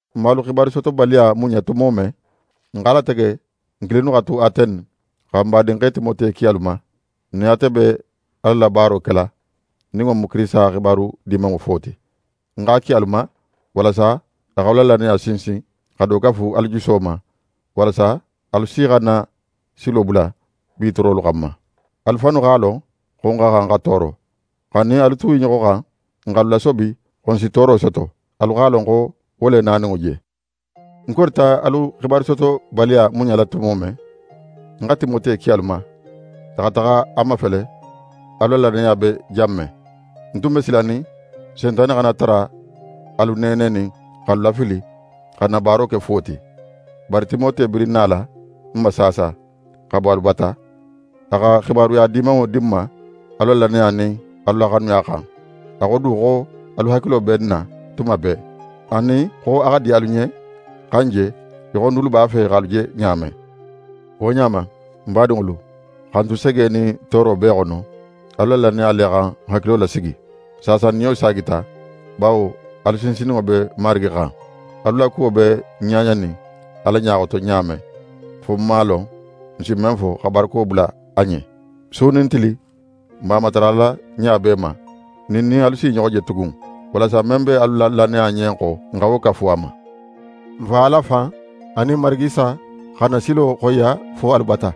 N man alu xibarusotobaliya muɲa tumo men, n x'a latege n kilinnu xa tu Atene, xa n badinxe Timote ki alu ma. N nin ate be Ala la baaro kela, nin wo mu Kirisita xibaru Dimanŋo fo ti. N x'a ki alu ma, walasa a x'alu la lannaya sinsin, xa do kafu alu juso ma; walasa alu si xana silo bula bi toorolu xanma. Alu fannu x'a lon xo n xa xan xa tooro. Xa n nin alu tu i ɲoxo xan, n x'alu lasobi xo n si tooro soto. Alu x'a lon xo wo le naninŋo je. Ń korita alu xibarusotobaliya muɲala tumo men, ń xa Timote ki alu ma, a xa taxa a mafele alu la lannaya be jan men. Ń tun be silanin Sentane xana tara alu neenenin x'alu lafili, xa n na baaro ke fuwo ti. Bari Timote birin nala n ma saasa, xa bo alu bata. A xa xibaruya dimanŋo di n ma alu la lannaya nin alu la xanuya xan. A xo du xo alu hakilo be n na tuma bee, anin xo a xa di alu ɲen xa n je, í xo n dulu b'a fe x'alu je ɲa men. Wo ɲa ma, n badinŋolu, xa n tu sege nin tooro bee xono, alu la lannaya le xa n hakilo lasigi. Saasa n niyo saagita, bawo alu sinsinninŋo be Marigi xan. Alu la kuwo be n ɲaɲanin Ala ɲa xoto ɲa men, fo n man a lon n si men fo xa barako bula a ɲen. Su nin tili, n b'a matarala ɲa bee ma nin n nin alu s'i ɲoxo je tugun, walasa men be alu la lannaya ɲen xo, n xa wo kafu a ma. N Fa Ala fan anin n Marigi Isa xa n na silo xoyiya fo alu bata.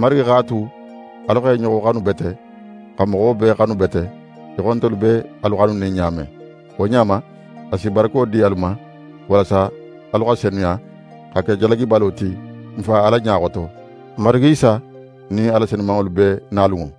Marigi x'a tu alu x'e ɲoxo xanu bete, xa moxo bee xanu bete, í xo ntelu be alu xanunin ɲa men. Wo ɲa ma, a si barako di alu ma walasa alu xa senuya, xa ke jalagibalo ti n Fa Ala ɲa xoto, n Marigi Isa nin a la senumanŋolu bee nalunŋo.